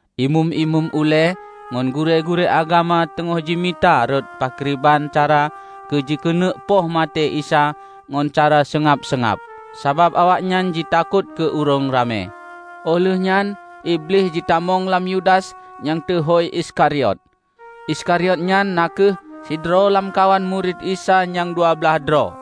Imeum-imeum ulée ngon gurée-gurée agama teungoh jimita rot pakriban cara keu jikeuneuk poh maté Isa ngon cara seungab-seungab, sabab awaknyan jitakot keu ureuëng ramé. Óh lheuehnyan Iblih jitamong lam Yudas nyang teuhôi Iskariot, Iskariot nyan na kheueh sidroe lamkawan murit Isa nyang dua blaih droe.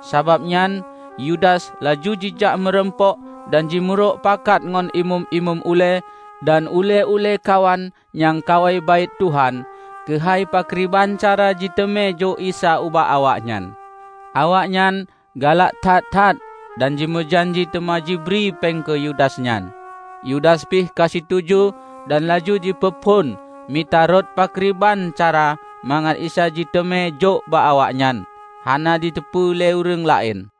Sabab nyan Yudas laju jijak meurumpok dan jimeurokpakat ngon Imeum-imeum ulée dan ulée-ulée kawan nyang kawai Baét Tuhan keuhai pakriban cara jiteumé jok Isa ubak awaknyan. Awaknyan galak that-that dan jimeujanji teuma jibri péng keu Yudas nyan. Yudas pih ka situju dan laju jipeuphon mita rot pakriban cara mangat Isa jiteumé jok bak awaknyan, hana jiteupeu lé ureuëng laén.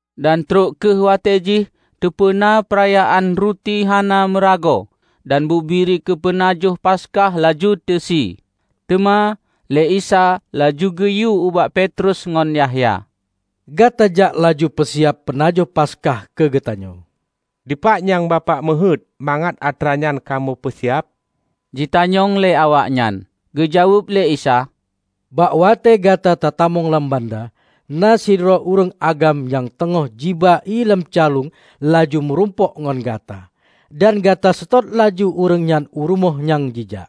Dan trok kheueh watée jih teupeuna peurayaan Ruti Hana Meuragoe dan bubiri keu peunajoh Paskah laju teusie. Teuma lé Isa laju geuyue ubak Petrus ngon Yahya, "Gata jak laju peusiab peunajoh Paskah keu geutanyoe." "Dipat nyang Bapak meuheuét mangat atra nyan kamoe peusiab?" jitanyong lé awaknyan. Geujaweueb lé Isa, "Bak watée gata tatamong lam banda, na sidroe ureuëng agam nyang teungoh jiba ié lam calueng laju meurumpok ngon gata. Dan gata seutôt laju ureuëng nyan u rumoh nyang jijak,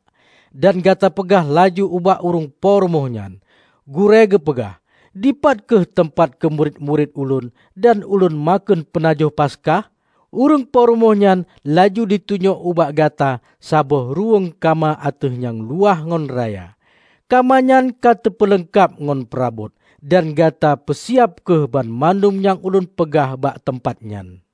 dan gata peugah laju ubak ureuëng po rumoh nyan: Gurée geupeugah, 'Dipat kheueh teumpat keu murit-murit Ulôn dan Ulôn makheun peunajoh Paskah?' Ureuëng po rumoh nyan laju jitunyok ubak gata saboh ruweueng kama ateueh nyang luwah ngon raya, kama nyan ka teupeuleungkab ngon peurabot. Dan gata peusiab kheueh banmandum nyang ulôn peugah bak teumpat nyan."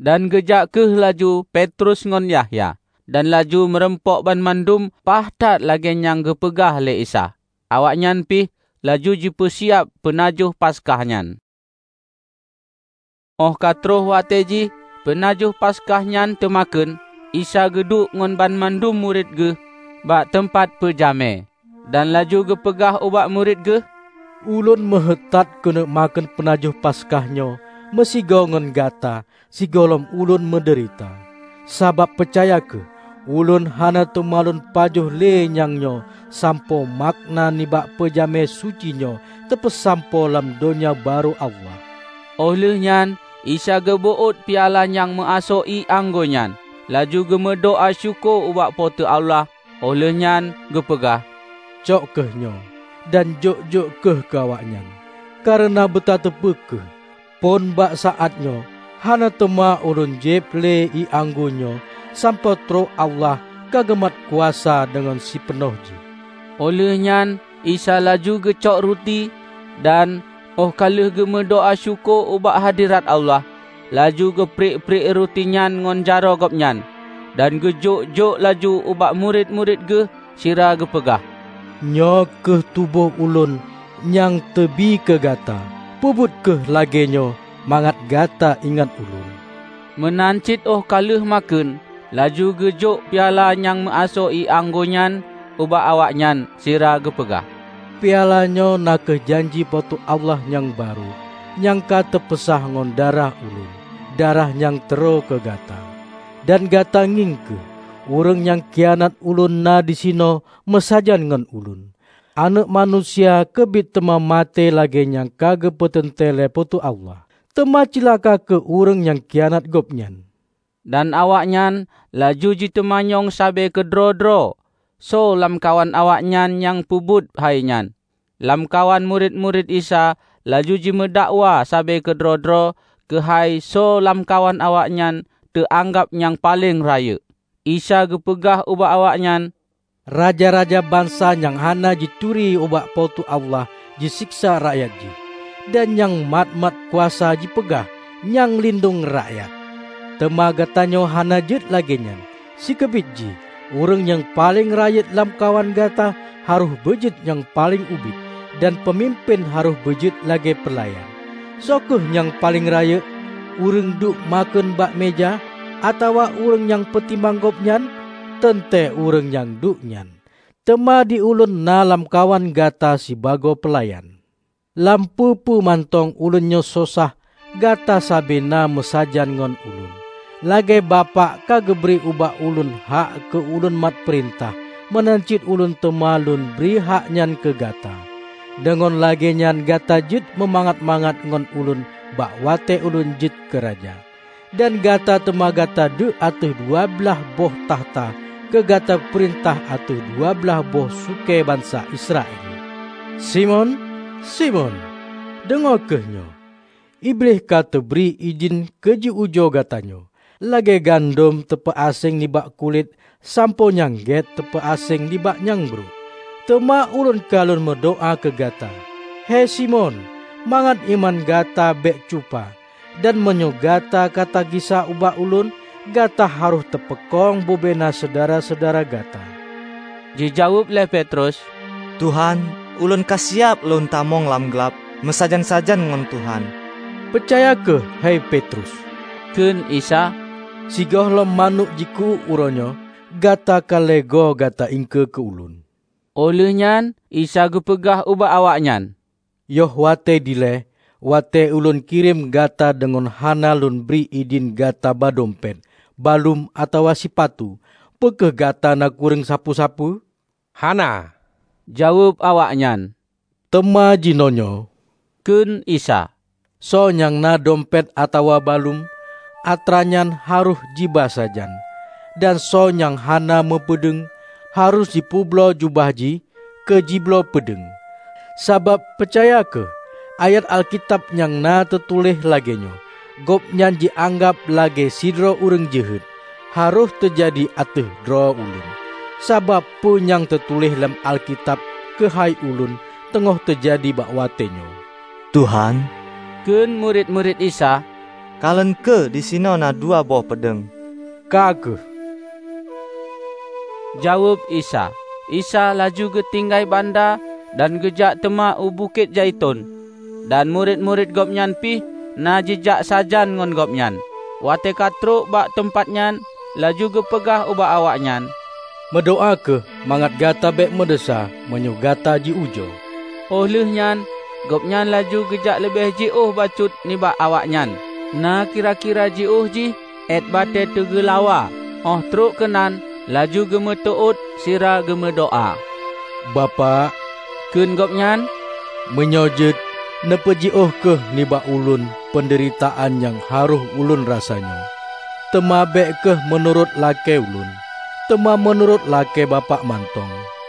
Dan geujak kheueh laju Petrus ngon Yahya, dan laju meurumpok banmandum paih that lagée nyang geupeugah lé Isa. Awaknyan pih laju jipeusiab peunajoh Paskah nyan. Óh ka troh watée jih peunajoh Paskah nyan teumakheun, Isa geuduek ngon banmandum murit geuh bak teumpat peujamé. Dan laju geupeugah ubak murit geuh, "Ulôn meuheuét that keuneuk makheun peunajoh Paskah nyoe meusigoe ngon gata sigohlom ulôn meudeurita! Sabab, peucaya kheueh: Ulôn hana teuma lôn pajoh le nyang nyoe sampoe makna nibak peujamé suci nyoe teupeusampoe lam Donya Barô Allah." Óh lheueh nyan Isa geubeuôt piala nyang meuasoe ié anggô nyan, laju geumeudoá syukoe ubak Po teu Allah, óh lheueh nyan geupeugah, "Cok kheueh nyoe, dan jok-jok kheueh keu awaknyan; kareuna beutateupeue kheueh: phon bak saát nyoe hana teuma ulôn jieb le ié anggô nyoe sampoe trok Allah ka geumat kuasa deungon sipeunoh jih." Óh lheueh nyan Isa laju geucok ruti. Dan óh ka lheueh geumeudoá syukoe ubak hadhirat Allah, laju geupriek-priek ruti nyan ngon jaroe Gobnyan dan geujok-jok laju ubak murit-murit Geuh sira geupeugah, "Nyoe kheueh tuboh Ulôn Nyang teubie keu gata. Peubuet kheueh lagée nyoe mangat gata ingat Ulôn." Meunan cit óh ka lheueh makheun, laju geujok piala nyang meuasoe ié anggô nyan ubak awaknyan sira geupeugah, "Piala nyoe na kheueh janji Po teu Allah nyang barô, nyang ka teupeusah ngon darah ulôn -- darah nyang teuroe keu gata." "Dan gata ngieng kheueh! Ureuëng nyang khianat Ulôn na disinoe meusajan ngon Ulôn! Aneuëk Manusia keubiet teuma maté lagée nyang ka geupeuteuntée lé Po teu Allah; teuma cilaka kheueh ureuëng nyang khianat Gobnyan!" Dan awaknyan laju jiteumanyong sabe keudroe-droe, soe lamkawan awaknyan nyang peubuet hainyan. Lamkawan murit-murit Isa laju jimeudakwa sabe keudroe-droe keuhai soe lamkawan awaknyan teuanggab nyang paleng rayeuk. Isa geupeugah ubak awaknyan, "Raja-raja bansa nyang hana jituri ubak Po teu Allah jiséksa rakyat jih, dan nyang mat-mat kuasa jipeugah 'Nyang lindong Rakyat'. Teuma gatanyoe hana jeuet lagée nyan. Sikeubit jih, ureuëng nyang paleng rayeuk lamkawan gata harôh beujeuet nyang paleng ubit, dan peumimpén harôh beujeuet lagée peulayan. Soe kheueh nyang paleng rayeuk: ureuëng duek makheun bak meuja, atawa ureuëng nyang peutimang gobnyan? Teuntée ureuëng nyang duek nyan. Teuma di Ulôn na lamkawan gata sibagoe peulayan. Lam peue-peue mantong Ulôn nyoe sosah, gata sabe na meusajan ngon Ulôn. Lagée Bapak ka geubri ubak Ulôn hak keu Ulôn mat peurintah, meunan cit Ulôn teuma Lôn bri hak nyan keu gata. Deungon lagée nyan gata jeuet meumangat-mangat ngon Ulôn bak watée Ulôn jeuet keu Raja. Dan gata teuma gata duek ateueh dua blaih boh takhta keu gata peurintah ateueh dua blaih boh sukée bansa Israel." "Simon, Simon, deungoe kheueh nyoe! Iblih ka teubri idhin keu jiujoe gatanyoe; lagée gandom teupeu aséng nibak kulét sampoe nyang gét teupeu aséng nibak nyang brok. Teuma Ulôn ka Lôn meudoá keu gata, hei Simon, mangat iman gata bék cupa. Dan meunyoe gata katagisa ubak Ulôn, gata harôh tapeukong bubena syedara-syedara gata." Jijaweueb lé Petrus, "Tuhan, ulôn kasiab lôn tamong lam glab meusajan-sajan ngon Tuhan!" "Peucaya kheueh hei Petrus," kheun Isa, "sigohlom manök jiku-uék uroenyoe, gata ka lhée goe gata iengkeue keu Ulôn." Óh lheueh nyan Isa geupeugah ubak awaknyan, "Yoh watée dilée, watée Ulôn kirém gata deungon hana Lôn bri idhin gata ba dompet, baluem atawa sipatu, peu kheueh gata na kureueng sapeue-sapeue?" "Hana!" jaweueb awaknyan. "Teuma jinoenyoe," kheun Isa, "Soe nyang na dompet atawa baluem, atranyan harôh jiba sajan; dan soe nyang hana meupeudeueng, harôh jipeubloe jubah jih keu jibloe peudeueng. Sabab, peucaya kheueh, ayat Alkitab nyang na teutuléh lagée nyoe, 'Gobnyan jianggab lagée sidroe ureuëng jeuhet,' harôh teujadi ateueh droe Ulôn. Sabab peue nyang teutuléh lam Alkitab keuhai Ulôn teungoh teujadi bak watée nyoe." "Tuhan," kheun murit-murit Isa, "Kalon kheueh, disinoe na dua boh peudeueng." "Ka kheueh!" jaweueb Isa. Isa laju geutinggai banda dan geujak teuma u Bukét Zaiton, dan murit-murit Gobnyan pih na jijak sajan ngon Gobnyan. Watée ka trok bak teumpat nyan, laju geupeugah ubak awaknyan, "Meudoá kheueh mangat gata bék meudesya meunyoe gata ji-ujoe." Óh lheuehnyan Gobnyan laju geujak leubeh jiôh bacut nibak awaknyan, na kira-kira jiôh jih éuet batée teugeulawa, óh trok keunan laju geumeuteuôt sira geumeudoá, "Bapak," kheun Gobnyan, "Meunyoe jeuet, neupeujiôh kheueh nibak Ulôn peundeuritaan nyang harôh Ulôn rasanyoe. Teuma bék kheueh meunurot lakée Ulôn, teuma meunurot lakée Bapak mantong."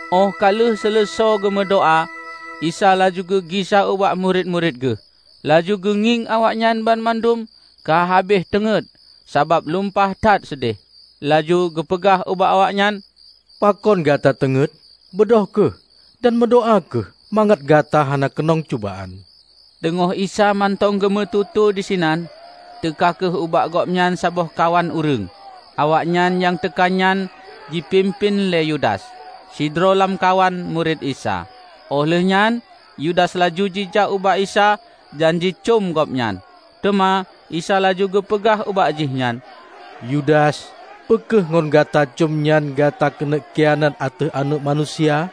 Óh ka lheueh seuleusoe geumeudoá, Isa laju geugisa ubak murit-murit geuh. Laju geungieng awaknyan banmandum ka habéh teungét sabab lumpah that seudeh. Laju geupeugah ubak awaknyan, "Pakon gata teungét? Beudôh kheueh dan meudoá kheueh mangat gata hana keunong cubaan." Teungoh Isa mantong geumeututoe disinan, teuka kheueh ubak gobnyan saboh kawan ureuëng. Awaknyan nyang teuka nyan jipimpén lé Yudas, sidroe lamkawan murit Isa. Óh lheuehnyan Yudas laju jijak ubak Isa dan jicöm Gobnyan. Teuma Isa laju geupeugah ubak jihnyan, "Yudas, peu kheueh ngon gata cöm nyan gata keuneuk khianat ateueh Aneuëk Manusia?"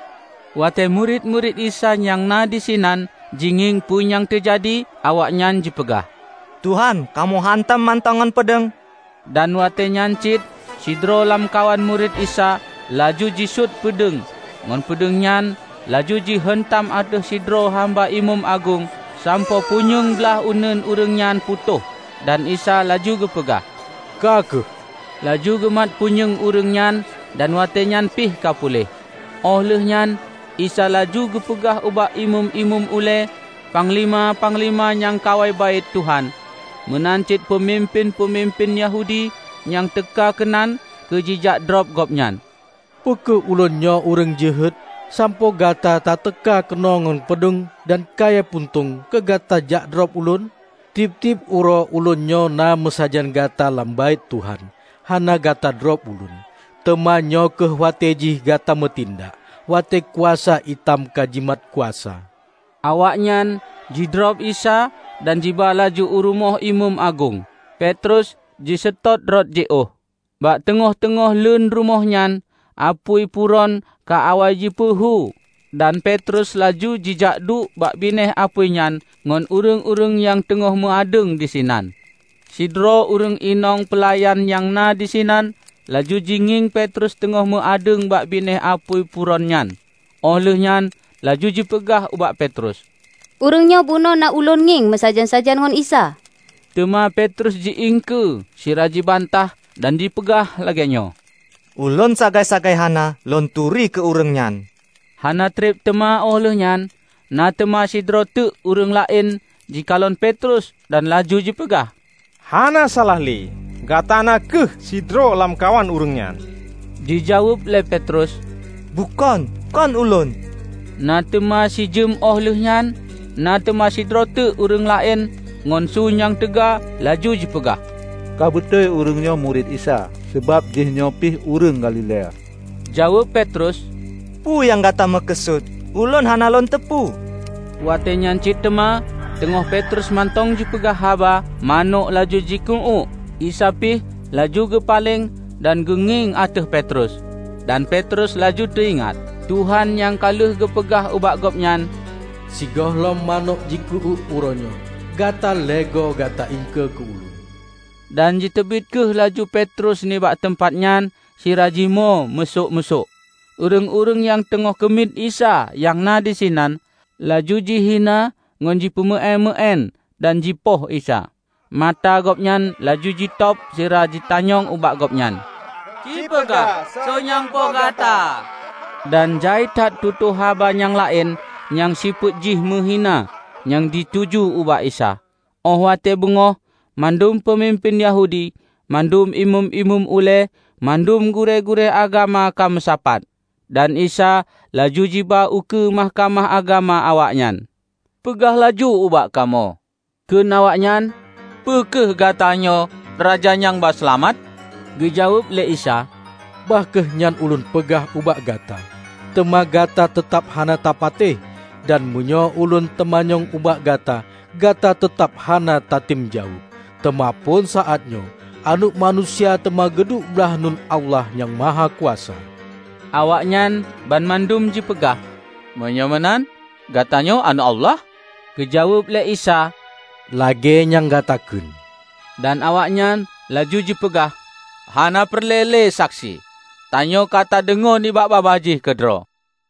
Watée murit-murit Isa nyang na disinan jingieng peue nyang teujadi, awaknyan jipeugah, "Tuhan, kamoe heuntam mantong ngon peudeueng!" Dan watée nyan cit sidroe lamkawan murit Isa laju jisuet peudeueng ngon peudeueng nyan laju jiheuntam ateueh sidroe hamba imeum agong sampoe punyueng blaih uneuen ureuëng nyan putôh. Dan Isa laju geupeugah, "Ka kheueh!" Laju geumat punyueng ureuëng nyan dan watéenyan pih ka puléh. Óh lheueh nyan Isa laju geupeugah ubak Imeum-imeum ulée Panglima-panglima nyang kawai Baét Tuhan, meunan cit peumimpén-peumimpén Yahudi nyang teuka keunan keu jijak drob Gobnyan, "Peu kheueh Ulôn nyoe ureuëng jeuhet, sampoe gata tateuka keunoe ngon peudeueng dan kayée puntông keu gata jakdrob Ulôn? Tieb-tieb uroe Ulôn nyoe na meusajan gata lam Baét Tuhan, hana gata drob Ulôn. Teuma nyoe kheueh watée jih gata meutindak, watée kuasa itam kajimat kuasa." Awaknyan jidrob Isa dan jiba laju u rumoh imeum agong. Petrus jiseutôt rot jiôh. Bak teungoh-teungoh leuen rumoh nyan apui puron ka awai jipeuhu dan Petrus laju jijakduek bak binéh apui nyan ngon ureuëng-ureuëng nyang teungoh meu adeueng disinan. Sidroe ureuëng inong peulayan nyang na disinan laju jingieng Petrus teungoh meu adeueng bak binéh apui puron nyan; óh lheueh nyan laju jipeugah ubak Petrus, "Ureuëng nyoe bunoe na ulôn ngieng meusajan-sajan ngon Isa!" Teuma Petrus ji-iengkeue sira jibantah dan jipeugah lagée nyoe, "Ulôn sagai-sagai hana lôn turi keu ureuëng nyan!" Hana treb teuma óh lheueh nyan, na teuma sidroe teuk ureuëng laén jikalon Petrus dan laju jipeugah, "Hana salah le, gata na kheueh sidroe lamkawan ureuëng nyan!" Jijaweueb lé Petrus, "Bukon, kon ulôn!" Na teuma sijeuem óh lheueh nyan, na teuma sidroe teuk ureuëng laén ngon su nyang teuga laju jipeugah, "Ka beutôi ureuëng nyoe murit Isa, sabab jih nyoe pih ureuëng Galilea!" Jaweueb Petrus, "Peue nyang gata meukeusut, ulôn hana lôn teupeu!" Watée nyan cit teuma, teungoh Petrus mantong jipeugah haba, manök laju jiku uéuk. Isa pih laju geupaleng dan geungieng ateueh Petrus. Dan Petrus laju teuingat Tuhan nyang ka lheueh geupeugah ubak gobnyan, "Sigohlom manök jiku-uék uroe nyoe, gata lhée goe gata iengkeue keu Ulôn." Dan jiteubiet kheueh laju Petrus nibak teumpat nyan sira jimoe musôk-musôk. Ureuëng-ureuëng nyang teungoh keumiet Isa nyang na disinan, laju jihina ngon jipeumeuéun-meuéun dan jipoh Isa. Mata Gobnyan laju jitôb sira jitanyong ubak Gobnyan, "Ci peugah soe nyang poh gata?" Dan jai that tutoe haba nyang laén nyang sifeuet jih meuhina nyang jituju ubak Isa. Óh watée beungoh, mandum peumimpén Yahudi, mandum Imeum-imeum ulée, mandum gurée-gurée agama ka meusapat, dan Isa laju jiba ukeue Mahkamah Agama awaknyan. "Peugah laju ubak kamoe," kheun awaknyan, "peue kheueh Gatanyoe Raja nyang ba Seulamat?" Geujaweueb lé Isa, "Bah kheueh nyan Ulôn peugah ubak gata, teuma gata teutab hana tapatéh. Dan meunyoe ulôn teumanyong ubak gata, gata teutab hana tatem jaweueb. Teuma phon saát nyoe, Aneuëk Manusia teuma geuduek blaih uneuen Allah Nyang Mahakuasa." Awaknyan banmandum jipeugah, "Meunyoe meunan, Gatanyoe Aneuëk Allah?" Geujaweueb lé Isa, "Lagée nyan gata kheun." Dan awaknyan laju jipeugah, "Hana peureulée lé saksi! Tanyoe ka tadeungoe nibak babah jih keudroe!"